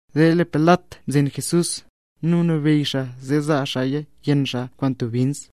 Zee lee Pilat mzen Jesús, nu mnabeyy zee zaa xaaya yenn xaa kwaan bins.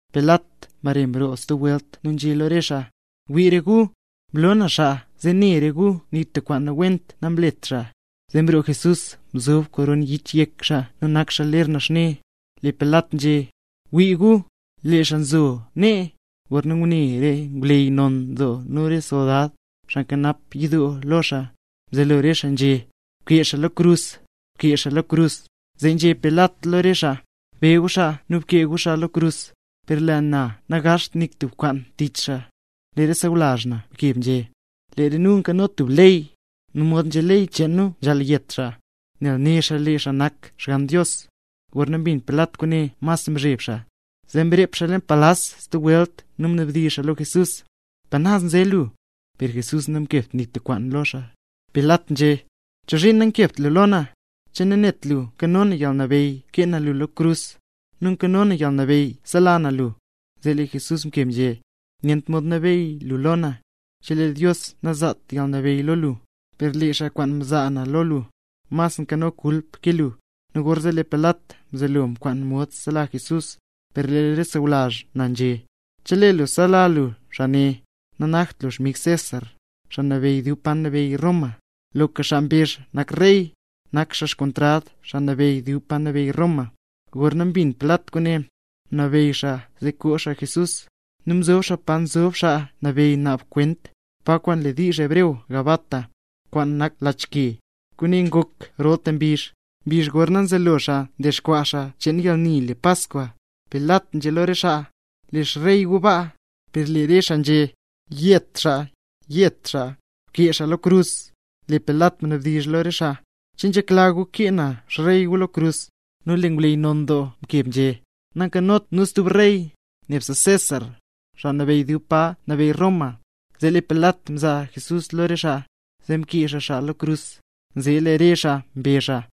Pilat mbare mroo stub welt nu nzhé lo re xaa: —Wii re gu, mlo na xaa, zee ne re gu nik tub kwaan nawent namlet xaa. Zee mroo Jesús nzob koron yich yek xaa nu nak xaa ler naxne. Lee Pilat nzhé: —¡Wii gu, lee xaa nzo nee! Gorna ngune re ngwleyy non nu re soldad, xaa nkanap yidoo lo xaa, mzelo re xaa nzhé: —¡Bkee xaa lo krus! ¡Bkee xaa lo krus! Zee nzhé Pilat lo re xaa: —Be gu xaa nu bkee gu xaa lo krus, per lee na nangaazht nik tub kwaan tich xaa. Lee re sawlazh na mkeb nzhé: —Lee re nu nkano tub ley, nu mod nzhé ley cheen nu nzhaal yet xaa, nel né xaa lee xaa nak Xgann Dios. Gorna mbin Pilat kwaane mas mzheb xaa. Zee mrep xaa leen palas stub welt nu mnabdizh xaa lo Jesús: —¿Pa naz nze lu? Per Jesús namkebt nik tub kwaan lo xaa. Pilat nzhé: —¿Chozhiin nankebt lu lo na? ¿Che nanet lu nkano na yalnabeyy kee na lu lo krus, nu nkano na yalnabeyy sela na lu? Zee lee Jesús mkeb nzhé: —Nyent mod nabeyy lu lo na, chelee Dios namzaat yalnabeyy lo lu; per lee xaa kwaan mzaa na lo lu, mas nkano kulp ke lu. Nu gorzee lee Pilat mzelo mkwaan mod sela Jesús; per lee re sawlazh na nzhé: —¡Chelee lu sela lu xaa ne, nanakt lu xmig César, xaa nabeyy dub pa nabeyy Roma! ¡Loka xaa mbezh nak rey, nak xaa xkontrad xaa nabeyy dub pa nabeyy Roma! Gorna mbin Pilat kwaane, mnabeyy xaa zee koo xaa Jesús, nu mzob xaa pa nzob xaa nabeyy naab xaa kwent, pa kwaan le diizh hebreo Gabata, kwaan nak Lach Ke. Kwaane ngok rolta mbizh, mbizh gorna nzelo xaa ndexkwaa xaa cheen yalni le Paskwa. Pilat nzhé lo re xaa: —¡Lee xrey gu baa! Per lee re xaa nzhé: —¡Yet xaa! ¡Yet xaa! ¡Bkee xaa lo krus! Lee Pilat mnabdizh lo re xaa: —¿Che nzhekla gu kee na xrey gu lo krus? Nu lee ngwleyy non doo mkeb nzhé: —¡Nankanot nu stub rey, nebse César, xaa nabeyy dub pa nabeyy Roma! Zee lee Pilat mzaa Jesús lo re xaa, zee mkee xaa xaa lo krus, zee lee re xaa mbe xaa.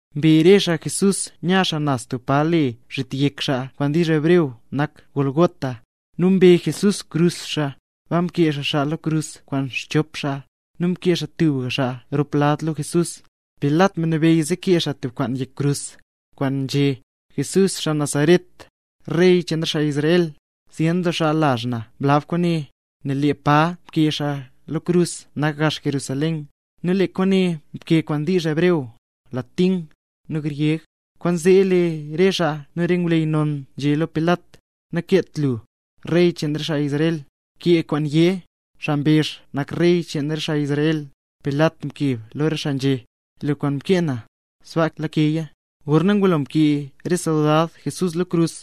Mbe re xaa Jesús nya xaa naz tub pa le Zhit Yek Xaa (kwaan wdizh hebreo nak Gólgota). Nu mbe Jesús xkrus Jesús. Baa mkee xaa xaa lo krus kwaan xchop xaa, nu mkee xaa tubga xaa rop lad lo Jesús. Pilat mnabeyy zee kee xaa tub kwaan yek krus, kwaan nzhé: “JESÚS XAA NAZARET, REY CHEEN RE XAA ISRAEL”. Zyen doo xaa lazh na mlab kwaane, nel lee pa nkee Jesús lo krus nak gax Jerusalén, nu lee kwaane nkee kwaan wdizh hebreo, latín, nu gryeg. Kwaanzee lee re xaa nu re ngwleyy non nzhé lo Pilat: —Nakeet lu: “Rey cheen re xaa Israel”, kee kwaan yé: “Xaa mbezh nak xaa Rey cheen re xaa Israel”. Per lee Pilat mkeb lo re xaa nzhé: —Lee kwaan mkee na, sbaa lakeya. Gorna ngulo mkee re soldad Jesús lo krus,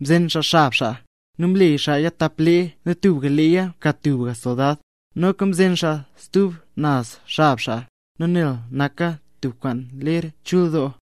mzen xaa xab xaa, nu mle xaaya tap lee nu tubga leeya mka tubga soldad. Noka mzen xaa stub naz xab xaa, nu nel naka tubka lee ler chul doo,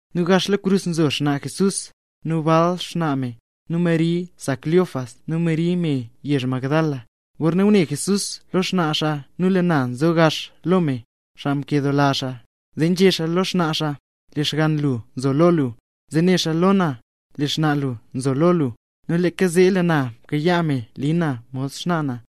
Nu gax lo krus nzo xnaa Jesús, nu bal xnaa xaa, nu Mari sa Cleofas nu Mari me yezh Magdala. Gor ne ngune Jesús lo xnaa xaa nu lee na nzo gax lo me, xaa nkedoola xaa, zee nzhé xaa lo xnaa xaa: —Lee xgann lu nzo lo lu. Zee né xaa lo na: —Lee xnaa lu nzo lo lu. Nu leeka zee, lee na mkayaa me li na mod xnaa na.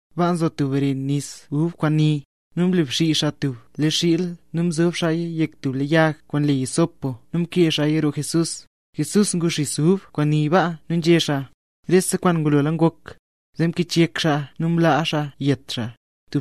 Baa nzo tub re xis ub kwaan ni. Nu mle bsii xaa tub lee xiil nu mzob xaaya yek tub lee yag kwaan le hisopo nu mkee xaaya roo Jesús. Jesús ngu xis ub kwaan ni ba nu nzhé xaa: —¡Rese kwaan ngulola ngok! Zee mkichyek xaa nu mlaa xaa yet xaa.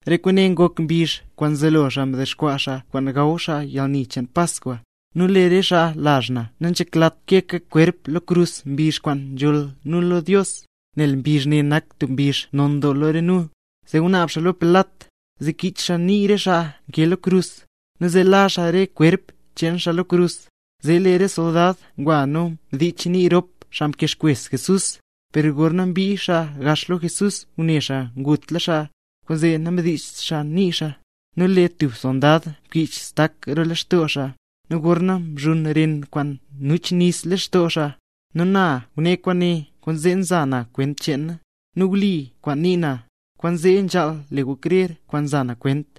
Re kwaane ngok mbizh kwaan mzelo nu ndexkwaa nu kwaan gaw nu yalni cheen Paskwa, nu lee re xaa lazh na nanzheklat keeka kwerp lo krus mbizh kwaan nzholl re nu lo Dios, nel mbizh ne nak tub mbizh non doo lo re nu. Zee ngunaab xaa lo Pilat, zee kich xaa nii re xaa nkee lo krus, nu zee la xaa re kwerp cheen xaa lo krus. Zee lee re soldad ngwa nu mdich nii rop xaa nkee xkwes Jesús. Per gorna mbii xaa gax lo Jesús ngune xaa ngutla xaa. Kwaanzee namdicht xaa nii xaa. Nu lee tub soldad mkich xtak roo lextoo xaa, nu gorzee mchuun ren kwaan nuch nis lextoo xaa. Nu na ngune kwaane, kwaanzee nza na kwent cheena, nu wli kwaan nii na; nu kwaanzee nzhaal le gu krer kwaan nza na kwent.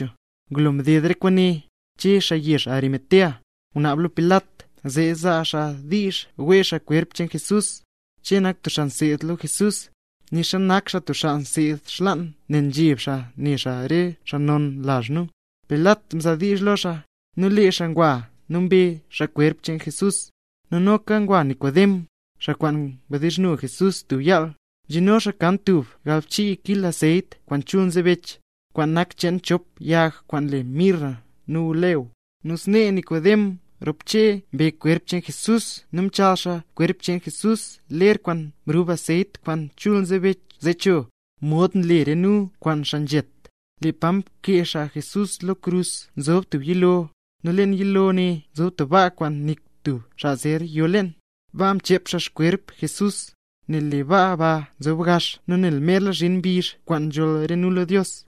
Ngulo mded re kwaane, Che xaa yezh Arimatea, ngunaab lo Pilat zee zaa xaa diizh wee xaa kwerp cheen Jesús. Che nak tub xaa mseed lo Jesús, nixa nak xaa tub xaa nseed xlaan nel nzheb xaa ne xaa re xaa non lazh nu. Pilat mzaa diizh lo xaa, nu lee xaa ngwa nu mbe xaa kwerp cheen Jesús. Nu noka ngwa Nikodem, xaa kwaan ngwa mdizhno Jesús tub yaal, mzhino xaa kan tub galbchii kil anseyt kwaan chul nzebech, kwaan nak cheen chop yag kwaan le mirra nu aloe. Nu snee Nikodem rop Che mbe kwerp cheen Jesús nu mchaal xaa kwerp cheen Jesús ler kwaan mrub anseyt kwaan chul nzebech zee cho, mod nle re nu kwaan xaa nzhet. Lee pa mkee xaa Jesús lo krus nzob tub yilo, nu leen yilo ne nzob tub baa kwaan nik tub xaa zer yo leen. Baa mchep xaa xkwerp Jesús, nel lee baa ba nzob gax nu nel merla zhin mbizh kwaan nzholl re nu lo Dios.